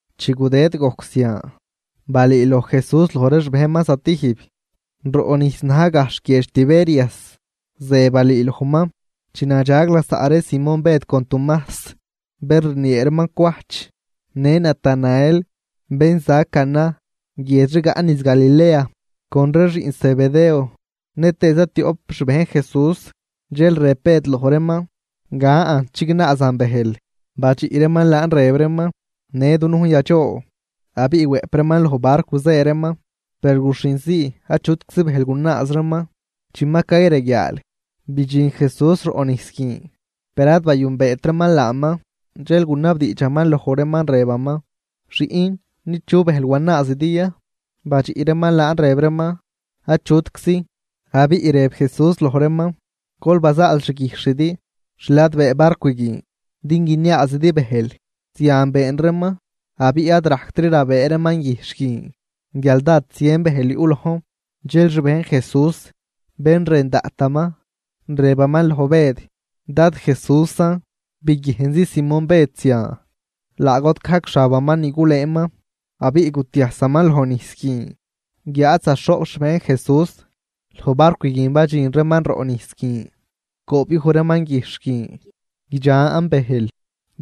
Chi gudëd gojc zian, balüüloj Jesús loj ree xbejnman zatijb, roꞌ nijs na̱j gajxh guiedx Tiberias. Ze balüülojman: Chi nadxag lasaꞌ ree Simón Bëd con Tumajs bén rniee reeman Cwajch, në Natanael bén za Caná guiedx rigaꞌ niz Galilea, con ree xiꞌn Zebedeo, nëtëë zatioꞌp xbejn Jesús, dxel rëb Bëd loj reeman: ―Gan chignaazan bëjl. Badxiꞌ reeman laan rëb reeman: ―Në dunujn yadxoo. Abiꞌ wëꞌp reeman loj barcw zë reeman, per guxhin zii achutczi bëjl gunaaz reeman. Chi ma cayreguiaal, bidxin Jesús roꞌ nijs guin, per ad bayünbeet reeman laaman. Dxel gunabdiidxaman loj reeman rëbaman: ―Xiꞌn, ¿nid chu bëjl wanaazidi ya? Badxiꞌ reeman laan rëb reeman: ―Achutczi. Abiꞌ rëb Jesús loj reeman: ―Gol bazaal xguijxhidi xladbee barcw guin din guiniaazidi bëjl. Zian been reeman, abiꞌ ad rajctri rabëë reeman guijxh guin, guial dád zien bëjl yuꞌ lojn. Dxel xbejn Jesús, bén rën daꞌtaman, rëbaman loj Bëd: ―¡Dad Jesúsan! Biguiejnzi Simón Bëd zian, laa got gajc xabaman ni gulëëman, abiꞌ gutiajsaman lojnijs guin. Guiáad zaxhoꞌp xbejn Jesús loj barcw guin badxin reeman roꞌ nijs guin, coobyuj reeman guijxh guin, guidxan bëjl,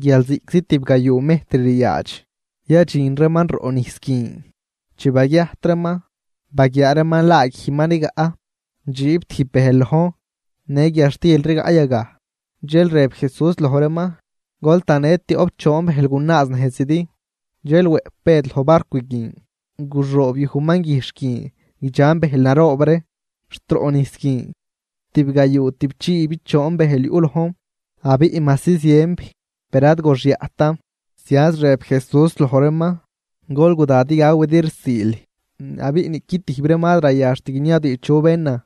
guial ziꞌctzi tibgayuu mejtr ryaadx yadxin reeman roꞌ nijs guin. Chi baguiajt reeman, baguiaa reeman laa guij ma rigaꞌ, dxiib tijb bëjl lojn, në guiadxtil rigaꞌ yagaj. Dxel rëb Jesús loj reeman: ―Gol tanë tioꞌp choon bëjl gunaaz nejzidi. Dxel wëꞌp Bëd loj barcw guin, guxoobyujman guijxh guin guidxan bëjl naroob ree, xt roꞌ nijs guin. Tibgayuu tüꞌpchiibichoon bëjl yuꞌ lojn. Abiꞌ majsi zienb, per ad goxyaꞌtan. Zianz rëb Jesús loj reeman: ―Gol guda din gawidi rsiil. Abiꞌ niꞌqui tijb reeman ad rayaxt guiniabdiidx chu bénan,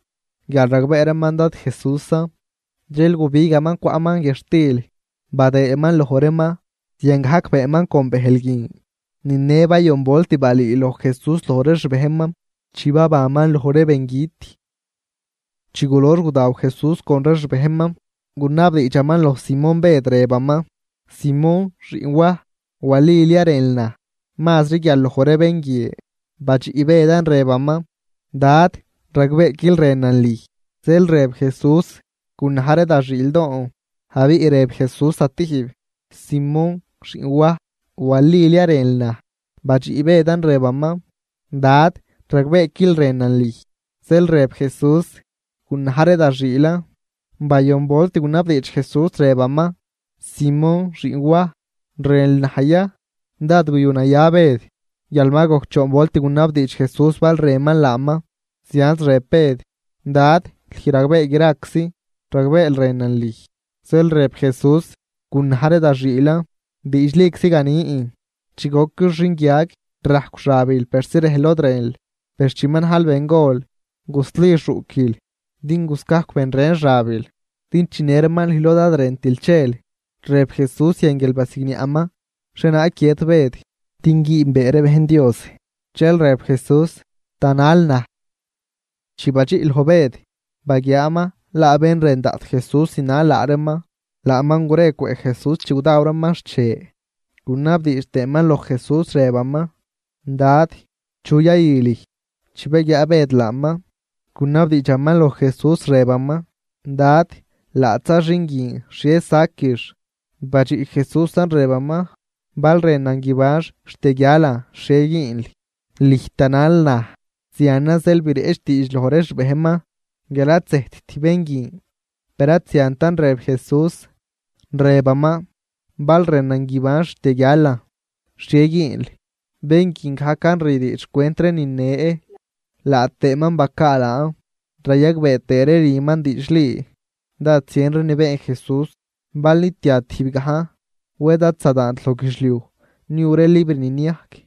guial ragbee reeman Dad Jesúsan. Dxel gubigaman cwaꞌman guiadxtil badëëman loj reeman, ziangajc beenman con bëjl guin. Ni ne bayon volt balüüloj Jesús loj ree xbejnman chi babanman loj ree bengüt. Chi gulox gudaw Jesús con ree xbejnman, gunabdiidxaman loj Simón Bëd, rëbaman: ―Simón, xiꞌn Waj, ¿walil ya rënl naj mazri guial loj ree bén guie? Badxiꞌ Bëdan rëbaman: ―Dad, ragbeequil rënan lüj. Zeel rëb Jesús: ―Gunaj ree da xiildoon. Abiꞌ rëb Jesús zatijb: ―Simón, xiꞌn Waj, ¿walil ya rënl naj? Badxiꞌ Bëdan rëbaman: ―Dad, ragbeequil rënan lüj. Zeel rëb Jesús: ―Gunaj ree da xiilan. Bayon volt gunabdiidx Jesús rëbaman: ―Simón, xiꞌn Waj, ¿rënl naj ya? Dád guyunaya Bëd, guial ma gojc choon volt gunabdiidx Jesús bal rënman laaman. Zianz rëb Bëd: ―Dad, lüj ragbee graczi, ragbeel rënan lüj. Zeel rëb Jesús: ―Gunaj ree da xiilan. Diidxliczi ganin, chi goquil xinguiag, rajcw xabil persi rejl lod rënl. Per chi ma najl bengol, gusli xuꞌquil din guscajcw ben ren xabil din chinë reeman lüj lod ad rëntil chel. Rëb Jesús zian guial basigniaꞌman xhienaag guiët Bëd, din güünbee ree bejn Dios. Dxel rëb Jesús: ―Tanal naj. Chi badxiꞌ loj Bëd, baguiaaman laa bén rën daꞌt Jesús zinal laa reeman. Laaman gure cwëꞌ Jesús chi gudaw reeman xche, gunabdiidx tëëman loj Jesús rëbaman: “Dad, ¿chu yayü lüj?” Chi baguiaa Bëd laaman, gunabdiidxaman loj Jesús rëbaman: ―Dad, laadxza xin guin, ¿xhie saquix? Badxiꞌ Jesúsan rëbaman: ―Bal rënan guibanx xt yaguialan, ¿xhie güünl? Lüj tanal naj. Zianan zeel bireꞌch diidx loj ree xbejnman guial ad zëjtt bén guin. Per ad ziantan rëb Jesús, rëbaman: “Bal rënan guibanx xt yaguialan, ¿xhie güünl?” Bén guin gajcan rü diidx xcwent ree nine, laa tëëman bacaa laan, rayagbee tëë ree rüman diidxli. Dád zien ree ni been Jesús, bal nitia tijb gajn, wed ad zadaant loj guidxliuj niu ree libr ni niajc.